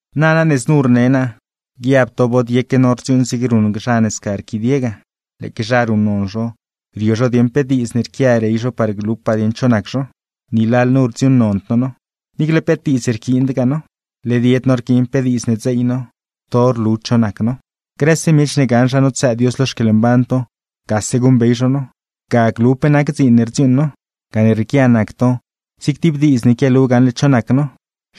Nana ne znu rne naa, guiab to bod yeque no rdziuuṉ zig ruṉ zha ne sca rquidie ga, lëëque zha ruṉnon zho, rio zho dieeṉ pe diidz ne rquia rey zho par glupaa dieṉ cho nac zho. Ni lalnu rdziuuṉnond no no, niicle peet diidz rquiindgaa no. Led yed no rquiin pe diidz ne dzeey no, to rlu cho nac no. Grëse miech ne gaṉ zha notsëë Dios lo xquieḻmban to, gase guṉbey zho no, ga glu pe nac dziin ne rdziuuṉ no. Gane rrieequia nac to zig tib diidz ne quialu gaṉle cho nac no.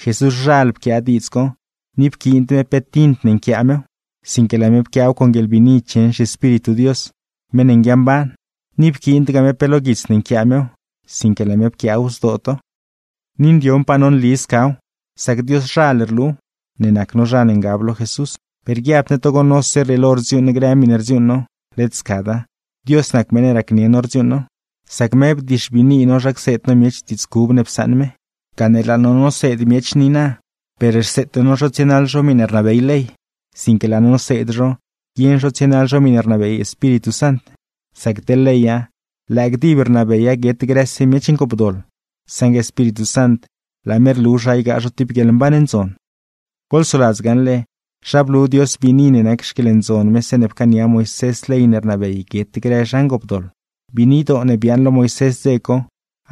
Jesúszhal pquiaa diidz co, ni pquiind me pe tint ne nquiaa mew, sinque laa me pquiaaw con guieḻbiini cheṉ zhiEspíritu Dios, meṉ ne nguiamban. Ni pquiindgaa me pe lo guits ne nquiaa mew, sinque laa me pquiaaw zdoo to. Ni ndioṉpaa no nli scaw, sac Dioszhal rluw, ne nac no zha ne ngab lo Jesús. Per guiabd ne togo nose rrieelo rdziuuṉ grë miṉe rdziuuṉ no, led scada, Dios nac meṉ ne racnieṉ no rdziuuṉ now; sac me bdixbiini no zha cseed no miech diidz cub ne psaṉ me. Gane laa no noseed miech niina, per rseete no zho tsienaḻ zho miṉe rnabey ley, sinque laa no noseed zho guieṉ zho tsienaḻ zho miṉe rnabey Espíritu Sant. Sac teḻ leya, lëë gdib rnabeya guet grëse miech ngoopdoḻ; saṉgue Espíritu Sant, laa me rlu zha ygaa zho tib guieḻmban ndzon. Goḻsoladz gaṉle, zha blu Dios biini ne nac xquieḻndzon me zeeṉe pcaania Moisés ley ne rnabey guet grë zha ngoopdoḻ. Biinidoo ne biaaṉ lo Moisés dze co,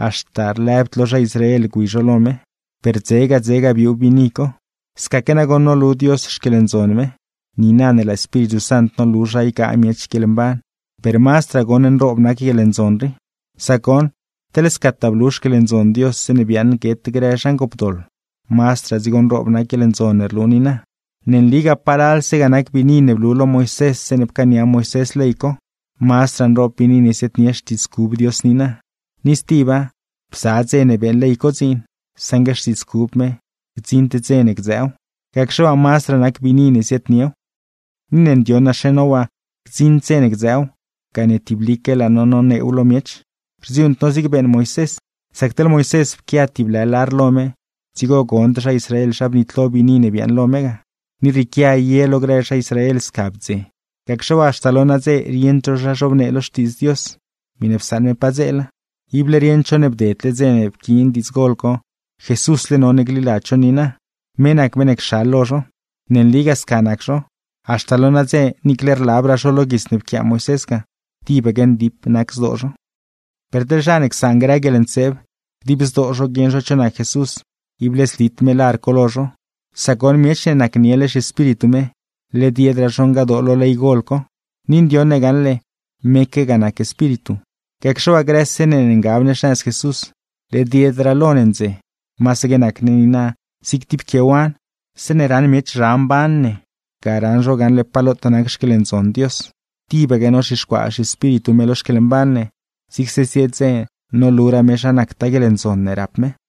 haxta lëbd lo zha Israel gwi zho lo me, per dzega dzega biuu biini co. Scaque nagoṉ nolu Dios xquieḻndzon me, niina ne laa Espíritu Sant nolu zha ygaa miech guieḻmban; per, ¡mazdraa goṉ nroob nac guieḻndzon rii! Sac goṉ, teḻ scataa blu xquieḻndzon Dios zeeṉe biaaṉ guet grë zha ngoopdoḻ; mazdraa dzigo nroob nac guieḻndzon ne rlu niina. Ne nligaa, palalse ga nac biini ne blu lo Moisés zeeṉe pcaania Moisés ley co, mazdraa nroob biini ne ziaadnie xtiidz cub Dios niina. Ni stiba, bza dze ne beeṉ ley co dziin; saṉgue xtiidz cub me, gdziṉd dze ne gdzëëw. Gacxe waa, mazdraa nac biini ne ziaadniew. Ni ne ndioṉaxe no waa gdziṉd dze ne gdzëëw, gane tiblique laa no noneew lo miech; rdziuuṉd no zig beeṉ Moisés. Sac teḻ Moisés, pquia tib lë lar lo me dzigo gond zha Israel zha bnitlo biini ne biaaṉ lo me ga. Ni rrieequia ye lo grë zha Israel ga sca bdze, gacxe waa, haxta lo nadze rieṉd zho zha zhobnee lo Xtiidz Dios, miṉe psaṉ me padzeela. Ible rieṉd zho ne bdedle dze ne pquiin diidz gol co, Jesúsle none gliladz zho niina. Me nac meṉ ne cxal lo zho. Ne nligaa sca nac zho, haxta lo nadze niicle rlabraa zho lo guits ne pquiaa Moisés ga, tibaque ndip nac zdoo zho. Per teḻ zha ne csaan grë guieḻntseeb, dib zdoo zho guieṉ zho cho nac Jesús, ible zlit me lar co lo zho; sac goṉ, miech ne nacniele zhiEspíritu me, led yedraa zho ngadoo lo ley gol co. Ni ndioṉ ne gaṉle, meque ga nac Espíritu. Gacxe waa, grëse ne ne ngab ne xnëz Jesús, led yedraa lo ne ndze. Masaque nac ne niina zig tib quiewan, zeeṉe ran miech zha mban ne, ga raṉ zho gaṉle pa lotaa nac xquieḻndzon Dios. Tibaque nozhixcuaa zhiEspíritu me lo xquieḻmban ne, zigse zie dze noluraa me zha nactaa guieḻndzon ne rap me.